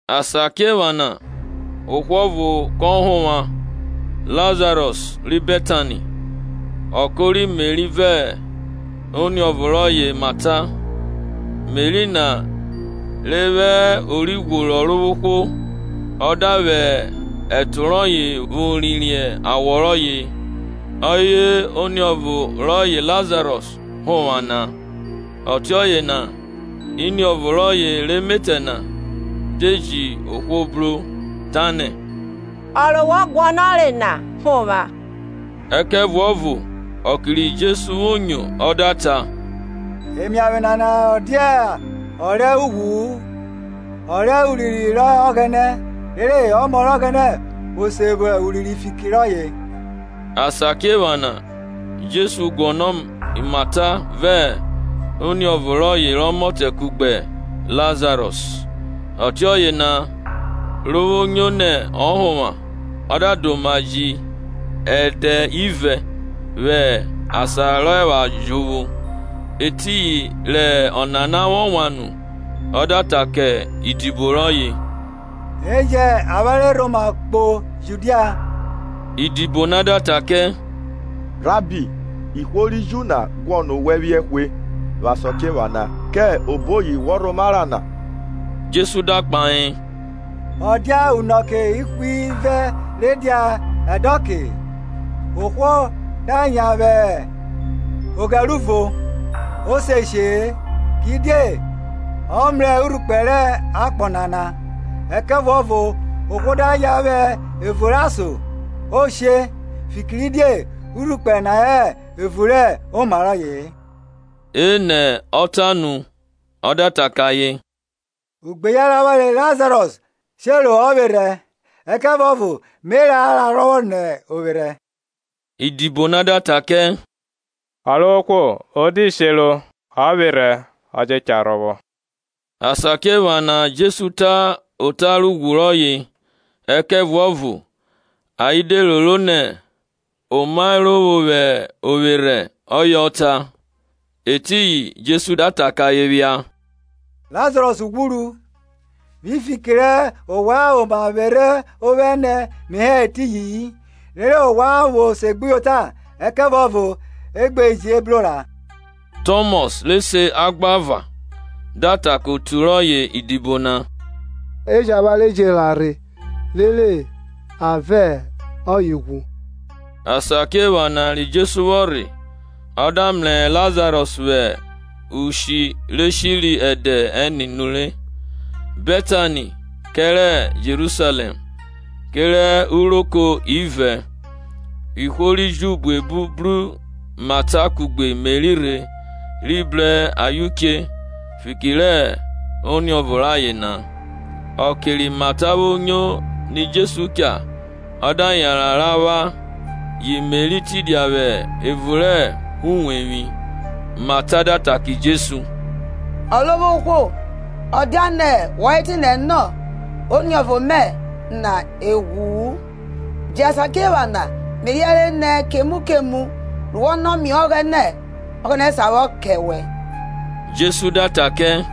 Asakiephana ohwo ọvo kọ honvwa, Lazarọs ri Betani, ọko rẹ Meri vẹ oniọvo rọye Mata. Meri na re vwẹ ori ghworo Ọrovwohwo ọ da vwẹ ẹto rọye vwo rhie awọ rọye, ọye oniọvo rọye Lazarọs họnvwa na. Ọtiọye na iniọvo rọye rẹ emetẹ na de ji ohwo bru Jesu ra, tanẹ, Ọrovwohwo, ọ re wọ guọnọre na họnvwa. Ẹkẹvuọvo ọke ri Jesu vwo nyo ọ da ta, Emiavwe nana ọ dia ọ rẹ ughwu-u; ọ rẹ a wan vwẹ urinrin vwọ kẹ Ọghẹnẹ, rere Ọmọ rẹ Ọghẹnẹ vwo se vwo urinrin fiki rọye. Asakiephana Jesu guọnọ Mata vẹ oniọvo rọye rẹ ọmọtẹ kugbe Lazarọs. Ọtiọye na ro vwo nyo nẹ ọ họnvwa, ọ da da oma ji ẹdẹ ivẹ vwẹ asan rọ epha jovwo. Etiyin rẹ ọnana vwọ wan nu ọ da ta kẹ idibo rọye, E jẹn avwanre rhoma kpo Judia. Idibo na da ta kẹ, Rabbi, ihwo ri Ju na guọnọ owẹ phiẹ hwe vwẹ asakiephana, kẹ oboyi wọ rhoma ra na? Jesu da kpahe, Ọ dia unọke ihwivẹ re dia ẹdọke? Ohwo da yan vwẹ ogheruvo, o se she-e, kidie ọ mrẹ urhukpẹ rẹ akpọ nana. Ẹkẹvuọvo ohwo da yan vwẹ evun rẹ ason, o she, fikiridie urhukpẹ na hẹ evun rẹ oma rọye-e. Enẹ o ta nu, ọ da ta kẹ ayen, Ugbeyan rẹ avwanre Lazaros shero ovwerhẹ, ẹkẹvuọvo me ra ra rhọvwọ nẹ ovwerhẹ. Idibo na da ta kẹ, Ọrovwohwo, o de shero ovwerhẹ, yọ je cha rhọvwọ. Asakiephana Jesu ta ota rẹ ughwu rọye, ẹkẹvuọvo ayen de roro nẹ omaerovwo vwẹ ovwerhẹ ọye ọ ta. Etiyin Jesu da ta kẹ ayen phia, Lazarọs ghwuru; vwi fiki rẹ ovwan oma vwerhe ovwẹ ne me hẹ eriyi-in, rere ovwan vwo segbuyota. Ẹkẹvuọvo e gbe je bro ra. Tọmọs, re se Agbava, da ta kẹ otu rọye idibo na, E jẹn avwanre je ra rhe, rere a vẹ ọye ghwu. Asakiephana ri Jesu vwọ rhe, ọ da mrẹ Lazarọs vwẹ ushi re shiri ẹdẹ ẹne nure. Betani kẹrẹ Jerusalẹm, kerẹ uroko ivẹ, ihwo ri Ju buebu bru Mata kugbe Meri rhe rhi bru ayen uche fiki rẹ oniọvo rayen na. Ọke ri Mata vwo nyo ni Jesu cha, ọ da yanran ra vwa, yi Meri tidia vwẹ evun rẹ uwevwi. Mata da ta kẹ Jesu, Ọrovwohwo, ọ diane wọ hẹ etinẹ nọ, oniọvo mẹ na e ghwu-u. Yẹ asakiephana me riẹnre nẹ kemu kemu ru wọ nọ mie Ọghẹnẹ, Ọghẹnẹ sa vwọ kẹ owẹ. Jesu da ta kẹ,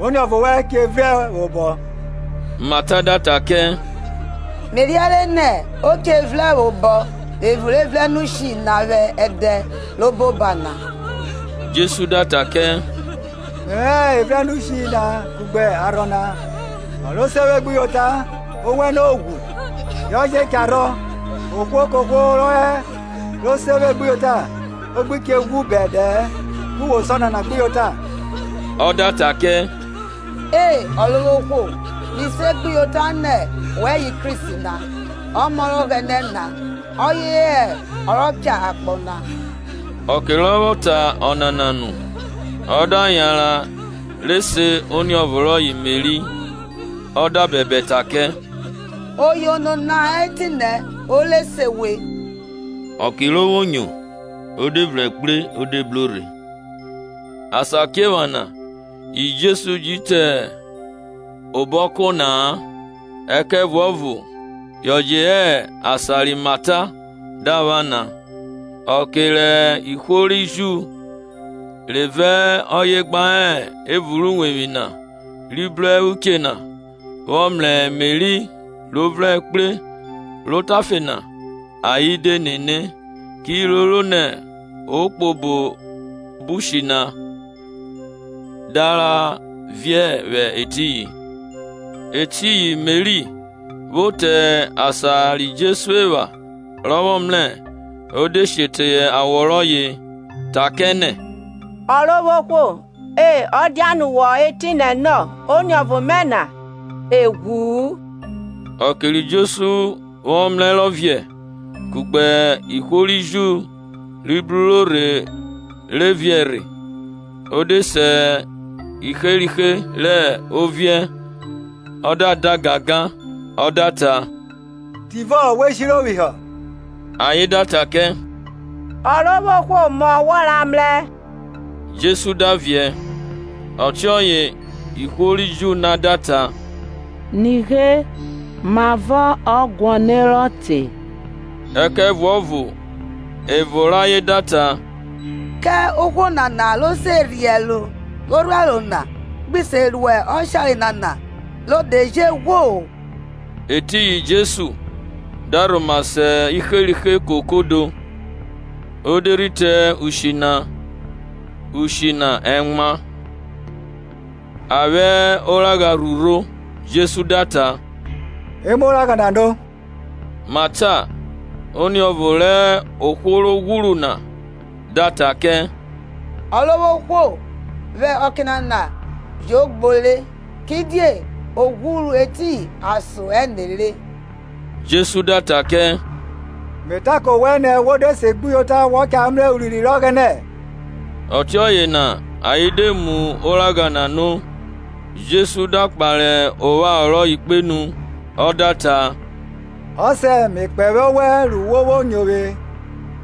Oniọvọ wẹn che vrẹn vwobọ. Mata da ta kẹ, Me riẹnre nẹ o che vrẹn vwobọ vwẹ evun rẹ evrẹnushi na vwẹ ẹdẹ rẹ obo oba na. Jesu da ta kẹ, Mẹvwẹ hẹ evrẹnushi na kugbe arhọ na; ọ ro se vwe gbuyota, owenẹ o ghwu, yọ je cha rhọ, ohwo kohwo rọ herọ ro se vwe gbuyota o gbi che ghwu bẹdẹ-ẹ. Ku wo se ọnana gbuyota? Ọ da ta kẹ, E, Ọrovwohwo; mi segbuyota nẹ wẹ hẹ Kristi na, Ọmọ rẹ Ọghẹnẹ na, ọye hẹ ọ rọ cha akpọ na. Ọke rọ vwọ ta ọnana nu, ọ da yanran re se oniọvo rọye Meri, ọ da bẹbẹ ta kẹ, Oyono na hẹ etinẹ o re se we. Ọke ro vwo nyo, o de vrẹn kpre o de bro rhe. Asakiephana yi Jesu ji te obo ọko na-a, ẹkẹvuọvo yọ je hẹ asan ri Mata da vwa na. Ọke rẹ ihwo ri Ju re vẹ ọye gba hẹ evun rẹ uwevwi na, ri bro uche na, vwọ mrẹ Meri ro vrẹri kpre ro otafe na, ayen de nene, ki roro nẹ o kpo obo ushi na da ra viẹ vwẹ etiyin. Etiyin Meri, vwo te asan ri Jesu epha rọ vwọ mrẹ, o de she teye awọ rọye, ta kẹ nẹ, Ọrovwohwo, ẹ dianẹ wọ hẹ etinẹ nọ, oniọvo mẹ na e ghwu-u. Ọke ri Jesu vwọ mrẹ rọ viẹ, kugbe ihwo ri Ju ri bruro rhe re viẹ rhe, o de se iherihe rẹ oviẹ ọ da da gangan; Ọ da ta, Tivọ we shiro phihọ? Ayen da ta kẹ, Ọrovwohwo, mọ wọramrẹ. Jesu da viẹ. Ọtiọye ihwo ri Ju na da ta, nighe mavọ ọ guọnerọ te. Ẹkẹvuọvo evo rẹ ayen da ta, Kẹ ohwo nana ro se rhiẹ ẹro rẹ orhuẹro na gbi se ru ọshare nana ro de je ghwo? Etiyin Jesu, da rhoma se iherihe kokodo, o de rhi te ushi na; ushi na ẹmwa, a vwẹ oragha rhurho. Jesu da ta, E mu oragha na no. Mata, oniọvo rẹ ohwo ro ghwuru na, da ta kẹ, Ọrovwohwo, vwẹ ọke nana yo gbore, kidie o ghwuru etiyin ason ẹne re. Jesu da ta kẹ, Me ta kẹ owẹ nẹ wo de segbuyota wọ cha mrẹ urinrin rẹ Ọghẹnẹ? Ọtiọye na ayen de mu oragha na no. Jesu da kpare opharo rọye kpenu ọ da ta, Ọsẹ, me kpẹvwẹ owẹ ru wo vwo nyo vwe.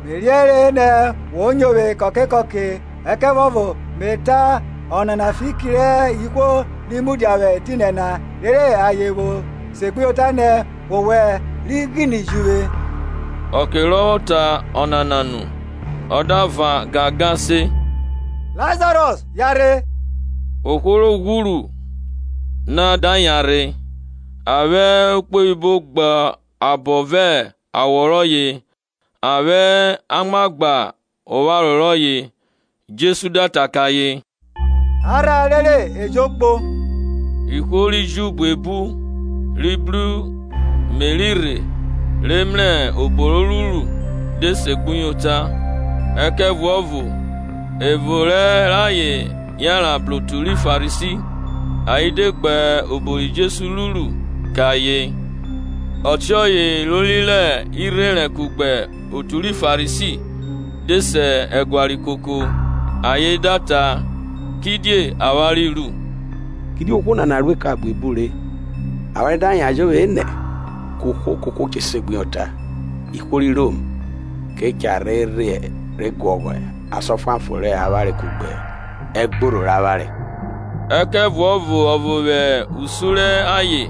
Me riẹnre nẹ wo nyo vwe kọke kọke, ẹkẹvuọvo me ta ọnana fiki rẹ ihwo ri mudia vwẹ etinẹ na, rere ayen vwo segbuyota nẹ wọwẹ ri ghine ji uvwe. Ọke rọ vwọ ta ọnana nu, ọ da van gangan se, Lazarọs, yanrhe. Ohwo ro ghwuru na da yanrhe, a vwẹ ukpoyibo gba abọ vẹ awọ rọye, a vwẹ amwa gba opharo rọye. Jesu da ta kẹ ayen, A rhan, rere e jo kpo. Ihwo ri Ju buebu, ri bru Meri rhe re mrẹ obo ro ruru, de segbuyota; ẹkẹvuọvo evo rẹ ayen yanran bru otu ri Farisi ayen de gbe obo ri Jesu ruru kẹ ayen. Ọtiọye ilori rẹ irherẹn kugbe otu ri Farisi de se ẹguare koko, ayen da ta, kidie avwanre ru? Kidie ohwo nana ruẹ eka buebu re. Avwanre da yan jovwo enẹ, kohwo kohwo che segbuyota, ihwo ri Rom ke cha rhe rhe guọghọ asan ọfuanfon rẹ avwanre kugbe ẹgborho rẹ avwanre. Ẹkẹvuọvo ọvo vwẹ usun rẹ ayen,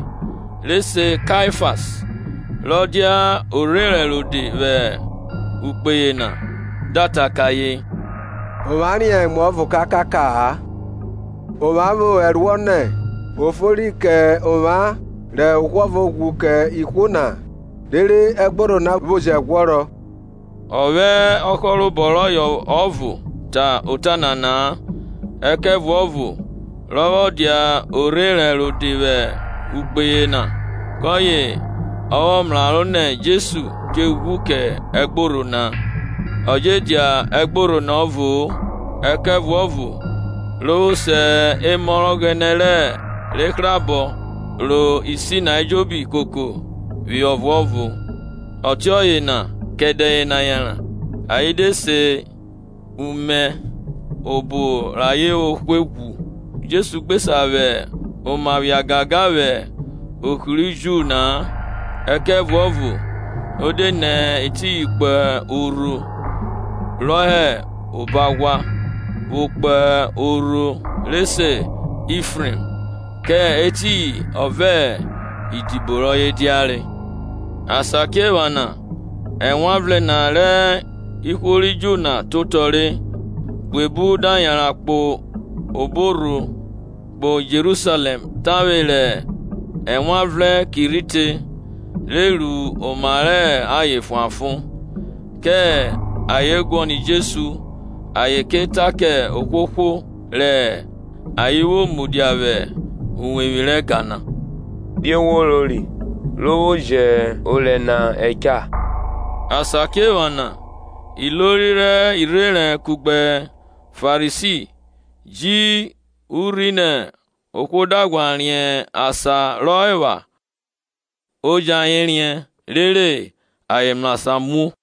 re se Kaifas, rọ dia orherẹn rode vwẹ ukpe yena da ta kẹ ayen, Ovwan riẹn emuọvo kakaka-a; ovwan vwo ẹruọ nẹ o fori kẹ ovwan rẹ ohwo ọvo vwo ghwu kẹ ihwo na, rere ẹgborho na vwo jẹ ghwọrọ. Ọ vwẹ ọhorọho rọye ọvo ta ọnana-a, ẹkẹvuọvo rọ vwọ dia orherẹn rode vwẹ ukpe yena kọye ọ vwọ mraro nẹ Jesu che ghwu kẹ ẹgborho na, ọ je dia ẹgborho na ọvo-o, ẹkẹvuọvo ro vwo se emọ rẹ Ọghẹnẹ re hrabọ ro isi na ejobi koko phihọ ọvuọvo. Ọtiọye na kẹ ẹdẹ yena yanran ayen de se umẹ rẹ obo rẹ ayen vwo hwe ghwu. Jesu gbe sa vwẹ oma phia gangan vwẹ ohri ri Ju na-a, ẹkẹvuọvo o de nẹ etiyin kpo orho rọ hẹ obo aghwa, vwo kpo orho re se Ifrem; kẹ etiyin ọ vẹ idibo rọye diare. Asakiephana Ewanvrẹn na rẹ ihwo ri Ju na te otọ re, buebu da yanran kpo obo orho kpo Jerusalẹm tavwe rẹ Ewanvrẹn ki rhi te, re ru oma rẹ ayen fuanfon. Kẹ ayen guọnọ Jesu ayen ke ta kẹ ohwohwo rẹ ayen vwo mudia vwẹ uwevwi rẹ ẹga na, Die wo rori? Ro vwo jẹ orẹ na ẹcha? Asakiephana ilori rẹ irherẹn kugbe Farisi ji urhi nẹ ohwo da ghwa riẹn asan rọ epha, o jẹn ayen riẹn, rere ayen mrasan muo.